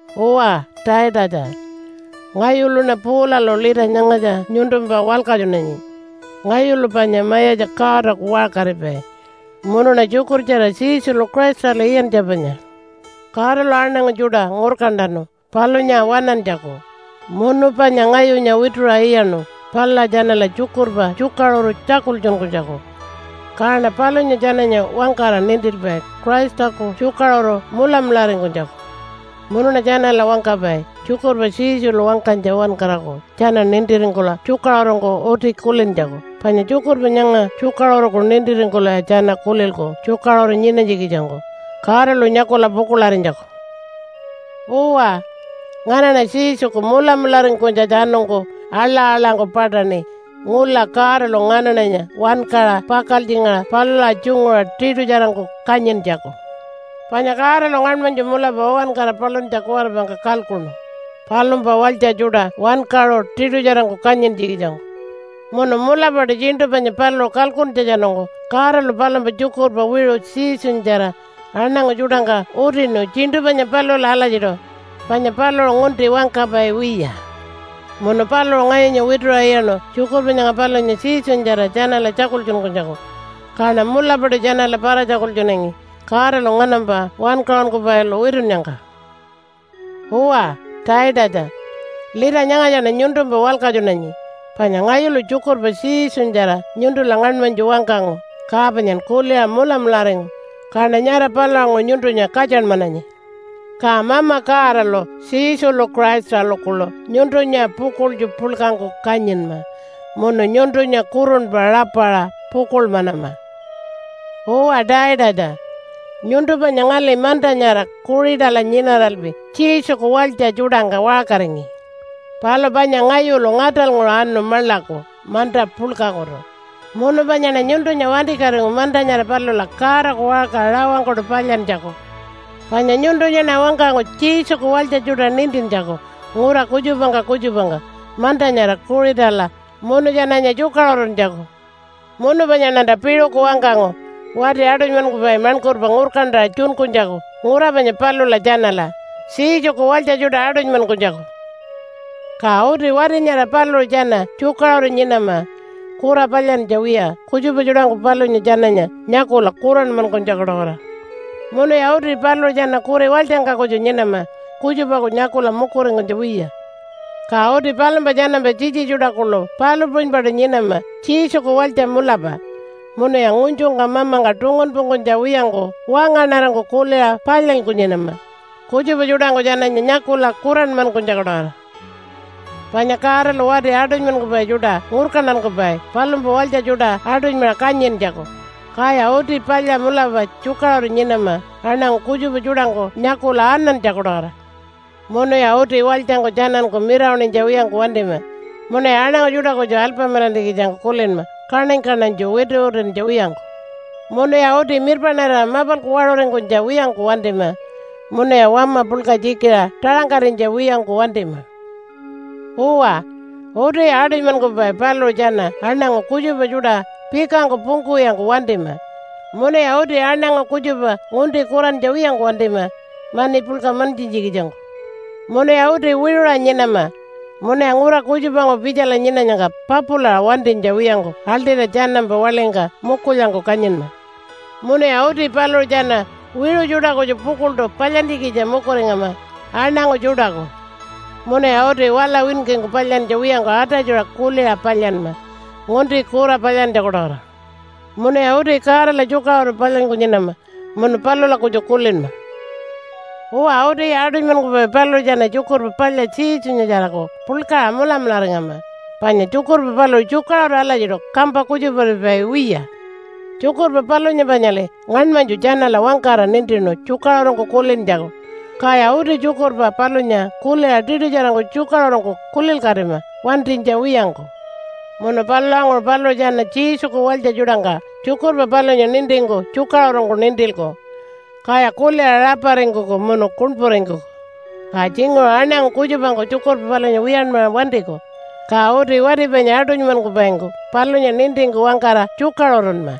Uwa Taitatja, ngayuluṉa Paulalu lita nyangatja nyuntumpa walkatjunanyi. Ngayulu panya Mayatja Godaku waṟkaripai, munuṉa tjukurtjara Jesulu Christalu iyantja panya. Godalu aṉangu tjuṯa ngurkantanu palunya waṉantjaku munu panya ngayunya wituṟa iyaṉu palula tjanala tjukurpa tjukaṟuru tjakultjunkunytjaku. Kaṉa palunya tjananya wangkara nintilpai Christaku tjukaṟuru mulamularingkunytjaku. Munuṉa tjanala wangkapai tjukurpa Jesulu wangkanytja uwankaraku tjana nintiringkula tjukaṟurungku uti kulintjaku. Panya tjukurpa nyanga tjukaṟuruku nintiringkulaya tjana kulilku tjukaṟuru nyinanytjikitjangku Godalu nyakula pukuḻarinytjaku. Uwa, nganaṉa Jesuku mulamularingkunytjatjanungku aḻa-aḻangku paṯaṉi ngula Godalu nganaṉanya wankaṟa pakaltjingaṟa palula tjunguṟa tiṯutjarangku kanyintjaku. Panya Godalu ngaṉmanytju mulapa uwankara paluntja kuwaripangka kalkuṉu palumpa walytja tjuṯa wankaṟu tiṯutjarangku kanyintjikitjangku. Munu mulapaṯu tjiṉṯu panya paluṟu kalkuntjatjanungku Godalu palumpa tjukurpa wiṟu Jesunyatjara aṉangu tjuṯangka utinu tjiṉṯu panya palula alatjiṯu, panya paluṟu ngunti wangkapai wiya. Munu paluṟu ngayunya wituṟa iyaṉu tjukurpa nyanga palunya Jesunyatjara tjanala tjakultjunkunytjaku, kaṉa mulapaṯu tjanala para-tjakultjunangi Godalu nganampa wankaṟunkupailu witunnyangka. Uwa Taitatja, lita nyangatjaṉa nyuntumpa walkatjunanyi, panya ngayulu tjukurpa Jesunyatjara nyuntula ngaṉmanytju wangkangu ka panyan kuliṟa mulamularingu, kaṉa nyara palulanguṟu nyuntunya katjanmananyi. Ka Mama Godalu Jesulu Christalu kuḻu nyuntunya pukuḻtju puḻkangku kanyinma munu nyuntunya kurunpa rapaṟa pukuḻmanama. Uwa Taitatja, nyuntu panya ngali manta nyara Kuṟitala nyinaralpi Jesuku walytja tjuṯangka waṟkaringi. Palu panya ngayulu ngaṯalnguṟu anu maḻaku manta puḻkakutu munu panyaṉa nyuntunya wantikatingu manta nyara palula Godaku waṟka rawangkuṯu palyantjaku. Panya nyuntunyaṉa wangkangu Jesuku walytja tjuṯa nintintjaku ngura kutjupangka kutjupangka manta nyara Kuṟitala munu tjananya tjukaṟuruntjaku. Munu panyaṉanta piṟuku wangkangu wati aṯunymankupai maṉkurpa ngurkantaṟa tjunkunytjaku ngura panya palula tjanala Jesuku walytja tjuṯa aṯunymankunytjaku. Ka uti wati nyara paluṟu tjana tjukaṟuru nyinama kura palyantja wiya kutjupa tjuṯangku palunya tjananya nyakula kuranmankunytjaku-tawara. Munuya uti paluṟu tjana kuri walytjangka kutju nyinama kutjupaku nyakula mukuringkunytja wiya. Ka uti palumpa tjanampa tjitji tjuṯa kuḻu palu puṟunypaṯu nyinama Jesuku walytja mulapa, munuya ngunytjungka mamangka tungunpungkunytja wiyangku wangaṉarangku kuliṟa palyanyku nyinama, kutjupa tjuṯangku tjananya nyakula kuranmankunytjaku-tawara. Panya Godalu wati aṯunymankupai tjuṯa ngurkantankupai palumpa walytja tjuṯa aṯunymaṟa kanyintjaku, kaya uti palya mulapa tjukaṟuru nyinama aṉangu kutjupa tjuṯangku nyakula anantjaku-tawara. Munuya uti walytjangku tjananku mirawaṉinytja wiyangku wantima munuya aṉangu tjuṯa kutju alpamilantjikitjangku kulinma kaṉany-kaṉanytju wituwituntja wiyangku. Munuya uti mirpaṉarira mapalku waṟuringkunytja wiyangku wantima, munuya wama puḻka tjikiṟa taṟangkarinytja wiyangku wantima. Uwa, utiya aṯunymankupai paluṟu tjana aṉangu kutjupa tjuṯa pikangku pungkuwiyangku wantima, munuya uti aṉangu kutjupa ngunti kurantja wiyangku wantima mani puḻka mantjintjikitjangku. Munuya uti wiṟuṟa nyinama, munuya ngura kutjupanguṟu pitjala nyinanyangka papulaṟa wantinytja wiyangku aḻṯira tjanampa waḻingka mukulyangku kanyinma. Munuya uti paluṟu tjana wiṟu tjuṯa kutju pukuḻṯu palyantjikitja mukuringama aṉangu tjuṯaku. Munuya uti wala winkingku palyantja wiyangku atatjuṟa kuliṟa palyanma ngunti kura palyantjaku-tawara. Munuya uti Godala tjukaṟuru palyanyku nyinama munu palula kutju kulinma. Uwa, utiya aṯunymankupai paluṟu tjana Tjukurpa Palya Jesunyatjaraku puḻkaṟa mulamularingama, panya tjukurpa paluṟu tjukaṟuru alatjiṯu kampa kutjuparipai wiya. Tjukurpa palunya panyali ngaṉmanytju tjanala wangkara nintinu tjukaṟurungku kulintjaku, kaya uti tjukurpa palunya kuliṟa tiṯutjarangku tjukaṟurungku kulilkatima wantinytja wiyangku. Munu palulanguṟu paluṟu tjana Jesuku walytja tjuṯangka tjukurpa palunya nintingku tjukaṟurungku nintilku, kaya kuliṟa raparingkuku munu kuṉpuringkuku. Ka tjinguṟu aṉangu kutjupangku tjukurpa palunya wiyanmaṟa wantiku, ka uti wati panya aṯunymankupaingku palunya nintingku wangkara tjukaṟurunma.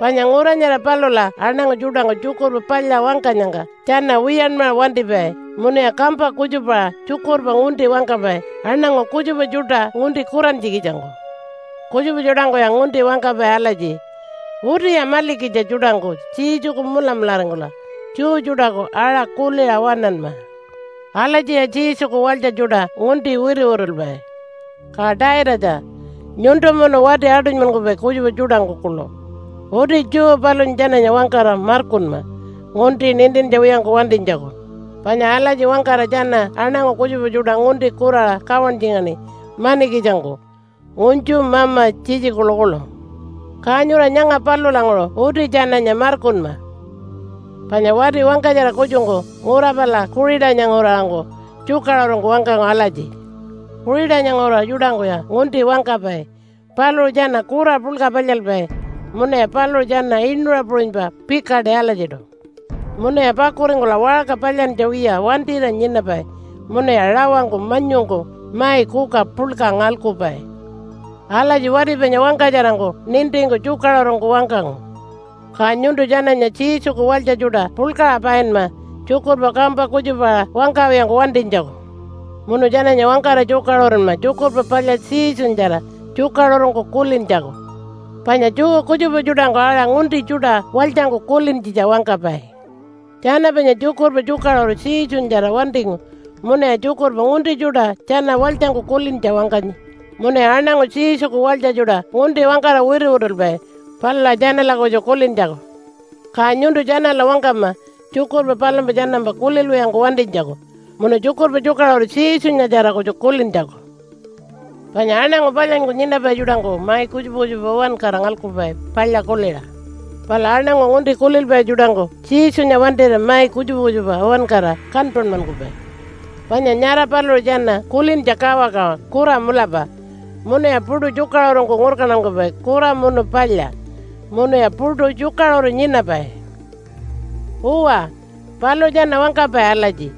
Panya ngura nyara palula aṉangu tjuṯangku Tjukurpa Palya wangkanyangka tjana wiyanmaṟa wantipai munuya kampa kutjupaṟa tjukurpa ngunti wangkapai aṉangu kutjupa tjuṯa ngunti kurantjikitjangku. Kutjupa tjuṯangkuya ngunti wangkapai alatji, “Utiya malikitja tjuṯangku Jesuku mulamularingkula Jew tjuṯaku aṟa kuliṟa waṉanma.” Alatjiya Jesuku walytja tjuṯa ngunti wituwitulpai. Ka Taitatja, nyuntu munu wati aṯunymankupai kutjupa tjuṯangku kuḻu uti Jew palunya tjananya wangkara markunma ngunti nintintja wiyangku wantinytjaku, panya alatji wangkara tjana aṉangu kutjupa tjuṯa ngunti kuraṟa kawantjingaṉi manikitjangku ngunytju mama tjitji kuḻukuḻu. Ka nyura nyanga palulanguṟu uti tjananya markunma. Panya wati wangkatjara kutjungku ngura pala Kuṟitanya nguraṟangku tjukaṟurungku wangkangu alatji, “Kuṟitanya nguraṟa tjuṯangkuya ngunti wangkapai. Paluṟu tjana kura puḻka palyalpai munuya paluṟu tjana inuṟa puṟunypa pikaṯi alatjiṯu. Munuya pakuringkula waṟka palyantja wiya wantira nyinapai munuya rawangku manyungku mai kuka puḻka ngalkupai.” Alatji wati panya wangkatjarangku nintingku tjukaṟurungku wangkangu. Ka nyuntu tjananya Jesuku walytja tjuṯa puḻkaṟa painma tjukurpa kampa kutjupaṟa wangkawiyangku wantinytjaku. Munu tjananya wangkara tjukaṟurunma Tjukurpa Palya Jesunyatjara tjukaṟurungku kulintjaku. Panya Jew kutjupa tjuṯangku aṟa ngunti tjuṯa walytjangku kulintjitja wangkapai. Tjana panya tjukurpa tjukaṟuru Jesunyatjara wantingu munuya tjukurpa ngunti tjuṯa tjana walytjangku kulintja wangkanyi munuya aṉangu Jesuku walytja tjuṯa ngunti wangkara wituwitulpai palula tjanala kutju kulintjaku. Ka nyuntu tjanala wangkama tjukurpa palumpa tjanampa kulilwiyangku wantinytjaku munu tjukurpa tjukaṟuru Jesunyatjara kutju kulintjaku. Panya aṉangu palyanyku nyinapai tjuṯangku mai kutjupa kutjupa uwankara ngalkupai palya kuliṟa. Palu aṉangu ngunti kulilpai tjuṯangku Jesunya wantira mai kutjupa kutjupa uwankara kanpanmankupai. Panya nyara paluṟu tjana kulintja kawakawa kura mulapa, munuya puṯu tjukaṟurungku ngurkantankupai kura munu palya, munuya puṯu tjukaṟuru nyinapai. Uwa, paluṟu tjana wangkapai alatji,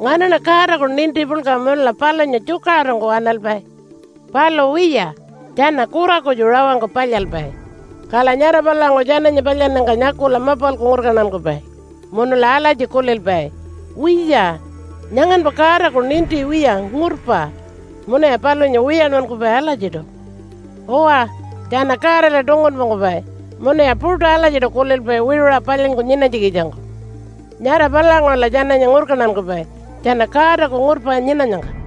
“Nganaṉa Godaku ninti puḻka munula palunya tjukaṟurungku waṉalpai.” Palu wiya, tjana kura kutju rawangku palyalpai, kala nyara palulanguṟu tjananya palyannyangka nyakula mapalku ngurkantankupai munula alatji kulilpai, “Wiya, nyanganpa Godaku ninti wiya ngurpa, munuya palunya wiyanmankupai alatjiṯu.” Uwa, tjana Godala tungunpungkupai munuya puṯu alatjiṯu kulilpai wiṟuṟa palyanyku nyinanytjikitjangku. Nyara palulanguṟula tjananya ngurkantankupai tjana Godaku ngurpa nyinanyangka.